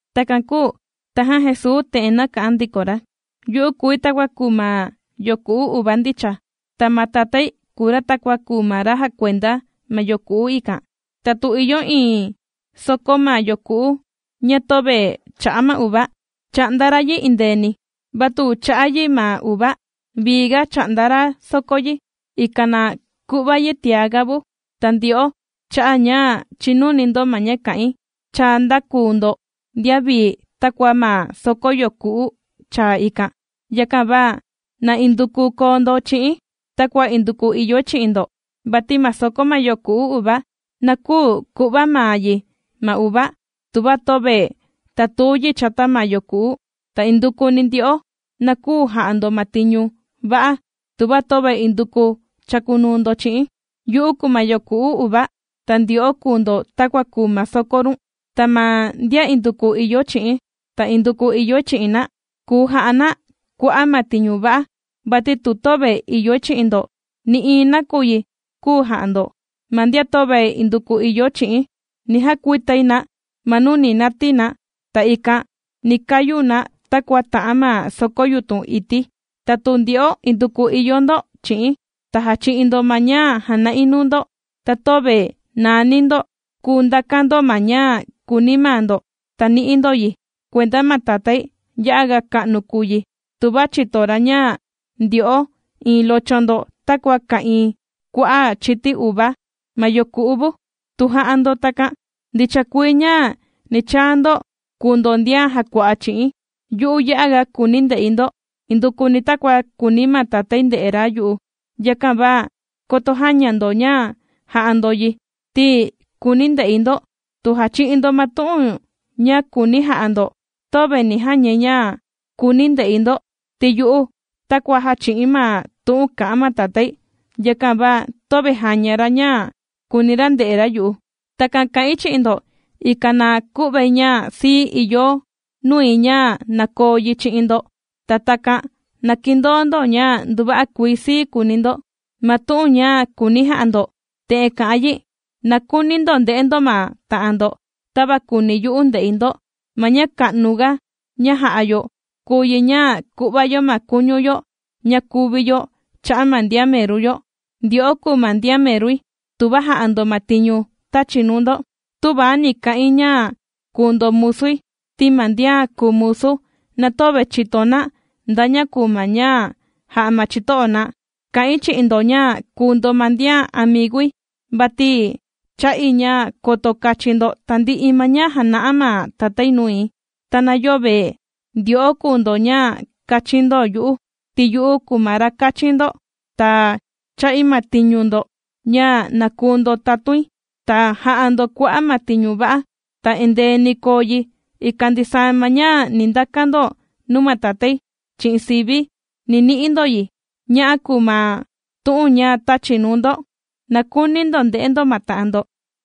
Takan kūu tajan Jesuu te'en nāka'an ndiko ra: ―Yu'u kùi takua kùu ma yoku'u uva ndicha, ta ma Tatái kùu ra takua kùu ma ra jàkuenda ma yoku'u ikan. Ta tu ìyo iin soko ma yoku'u ña töve chà'a ma uva, chà'nda ra yi endeeni. Va tu chà'a yi ma uva, vii ga chà'nda ra soko yi, ikan na ku'va yi tiaga vu. Ta ndyo'o, cha'a' ña chìnuni ndo ma ña kà'in, cha ndākuu ndo ndian vii takua ma soko yoku'u chaa ikan. Yakan va na induku koo ndo chi'i̱n, takua induku ìyoi chi'in ndo. Vati ma soko ma yoku'u uva, na küu ku'va maa yi ma uva, tuva töve tàtuu yi chata ma yoku'u. Ta indukuni, ndyo'o na küu ja'a ndo ma tiñu va'a, tuva töve induku chàkunuu ndo chi'i̱n. ’Yu'u kùu ma yoku'u uva, ta ndyo'o kùu ndo takua kùu ma soko run. Ta ma ndian induku ìyo chi'i̱n, ta induku ìyoi chi'in na; kùu ja'a na kua'a' ma tiñu va'a, vati tu töve ìyoi chi'in ndo, nï'iin nakuyi küu ja'a ndo. Ma ndian töve induku ìyo chi'i̱n, ni jakuitai na ma nuu ni natii na, ta ikan ni kayu na takua tà'an ma soko yutun ití. Ta tu ndyo'o induku ìyo ndo chi'i̱n, ta jàchi'in ndo ma ña jàna'i nuu ndo, ta töve nàani ndo, kùu ndakan ndo ma ña kùuni maa ndo, ta ni'i ndo yi. Kuenda ma Tatái, ya'aga ka'nu kùu yi, tuva chìto ra ña ndyo'o iin locho ndo takua ka'ìin kua'a' chiti uva ma yoku'u vu. Tu jà'a ndo takan, ndicha kuii ña ni chaa ndo kùu ndo ndian jàkua'a chi'i̱n. Yu'u ya'aga kùuni̱ nde'i ndo, indukuni takua kùuni ma Tatái nde'e ra yu'u. Yakan va koto jäña ndo ña jà'a ndo yi, ti kùuni̱ nde'i ndo. Tu jàchi'in ndo ma tu'un ña kùuni̱ ja'a ndo, töve ni jañai ña kùuni̱ nde'i ndo, ti yu'u takua jàchi'i̱n ma tu'un kà'an ma Tatái. Yakan va töve jàña ra ña kùuni ra nde'e ra yu'u. ’Takan kà'in chi'in ndo, ikan na ku'vai ña sii ìyo nui ña na koo yi chi'in ndo. Ta takan na kindoo ndo ña nduva'a kuii sii kuuni ndo. Ma tu'un ña kùuni̱ ja'a ndo, te'en kà'an yi: na kuuni ndo nde'e ndo ma ta'an ndo, tava kùuni yu'u nde'i ndo. Ma ña ka'nuga ña jà'a yo kùu yi ña ku'va yo ma kuñu yo ña kuvi yo cha'a' ma ndian meru yo. Ndyo'o kùu ndo ndian merui, tuva jà'a ndo ma tiñu tāchi̱ nuu ndo. Tüva ni ka'in ña kùu ndo musui, ti ma ndian kùu musu, na töve chìto na nda ña kùu ma ña jà'a ma chito'o na. Kà'in chi'in ndo ña kùu ndo ma ndian amigui, vati chà'i ña koto kachin ndo tandi'i ma ña jāna'a ma Tatái nui. Ta na yöve ndyo'o kùu ndo ña kāchin ndo yu'u, ti yu'u kùu ma ra kāchi̱n ndo, ta chā'i ma tiñu ndo ña na kùu ndo tatuin, ta jà'a ndo kua'a' ma tiñu va'a. Ta endee ni koo yi, ikan ndisaa ma ña ni ndakan ndo nuu ma Tatái chi'in sivi̱, ni ni'i ndo yi. Ña'a kùu ma tu'un ña tāchi̱ nuu ndo: na kuuni ndo nde'e ndo ma ta'an ndo.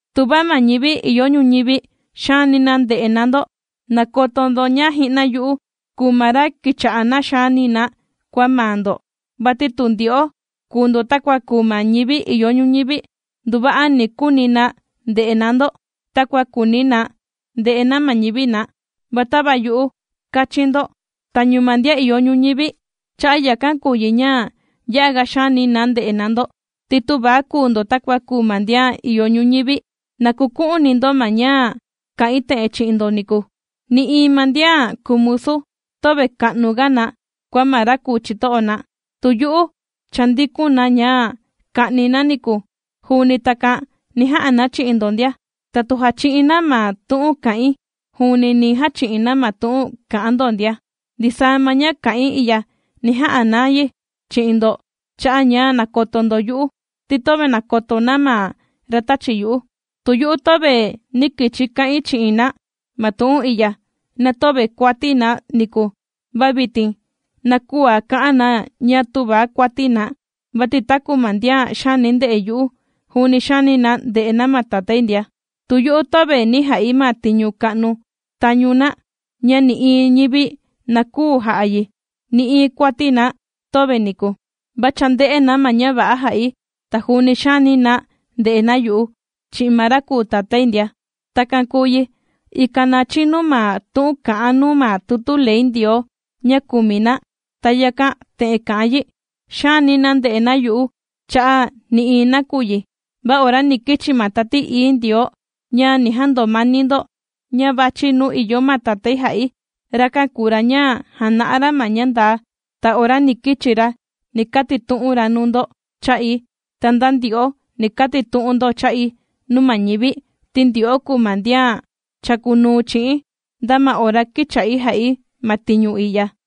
’Tuva ma ñivi ìyo ñuñivi xaani na ndè'e na ndo, na koto ndo ña ji'na yu'u kùu ma ra kīcha'a na xàani na kua maa ndo. Vati tu ndyo'o kùu ndo takua kùu ma ñivi ìyo ñuñivi, nduva'a ni kuuni na nde'e na ndo, takua kùuni na nde'e na ma ñivi na. Va tava yu'u kāchi̱n ndo tañu ma ndian ìyo ñuñivi, cha'a' yakan kùu yi ña ya'a ga xaani na ndè'e na ndo, ti tüva kuu ndo takua kùu ma ndian ìyo ñuñivi. Na kuku'uni ndo ma ña kā'in te'en chi'in ndo niku: “Nï'iin ma ndian kùu musu, töve ka'nuga na kua ma ra kùu chito'o na.” Tu yu'u chāndikun na ña ka'ni na niku, juuni takan ni ja'a na chi'in ndo ndia. Ta tu jàchi'in na ma tu'un kà'in, juuni ni jachi'in na ma tu'un kà'an ndo ndia. Ndisaa ma ña kà'in i'ya ni ja'a na yi chi'in ndo cha'a' ña nàkoto ndo yu'u, ti töve nàkoto na ma ra tāchi yu'u. ’Tu yu'u töve nī kichi ka'in chi'in na ma tu'un i'ya, na töve kuati na niku. Va vitin na küa ka'an na ña tüva kuati na. Vati taku ma ndian xaani ndè'e yu'u, juuni xaani na ndè'e na ma Tatái ndia. Tu yu'u töve nī ja'i ma tiñu ka'nu tañu na, ña nï'iin ñivi na küu ja'a yi, nï'iin kuati na töve niku. Va cha ndē'e na ma ña va'a jā'i, ta juuni xàani na nde'e na yu'u, chi'in ma ra kùu Tatái ndia. Takan kūu yi, ikan na chinu ma tu'un kà'an nuu ma tutu ley Ndioo ña kùmi na. Ta yakan te'en kà'an yi: “Xaani na ndè'e na yu'u cha'a' nï'iin nakuyi.” ’Va ora ni kichi ma Tati Ií Ndioo ña ni jandomani ndo, ña vàchi nuu ìyo ma Tatái jà'i, rakan kùu ra ña jàna'a ra ma ña ndaa, ta ora ni kichi ra ni katitu'un ra nuu ndo cha'i. Ta nda ndyo'o, ni katitu'un ndo cha'i nuu ma ñivi, ti ndyo'o kùu ma ndian chàkunuu chi'i̱n, nda ma ora kīcha'i jà'i ma tiñu i'ya.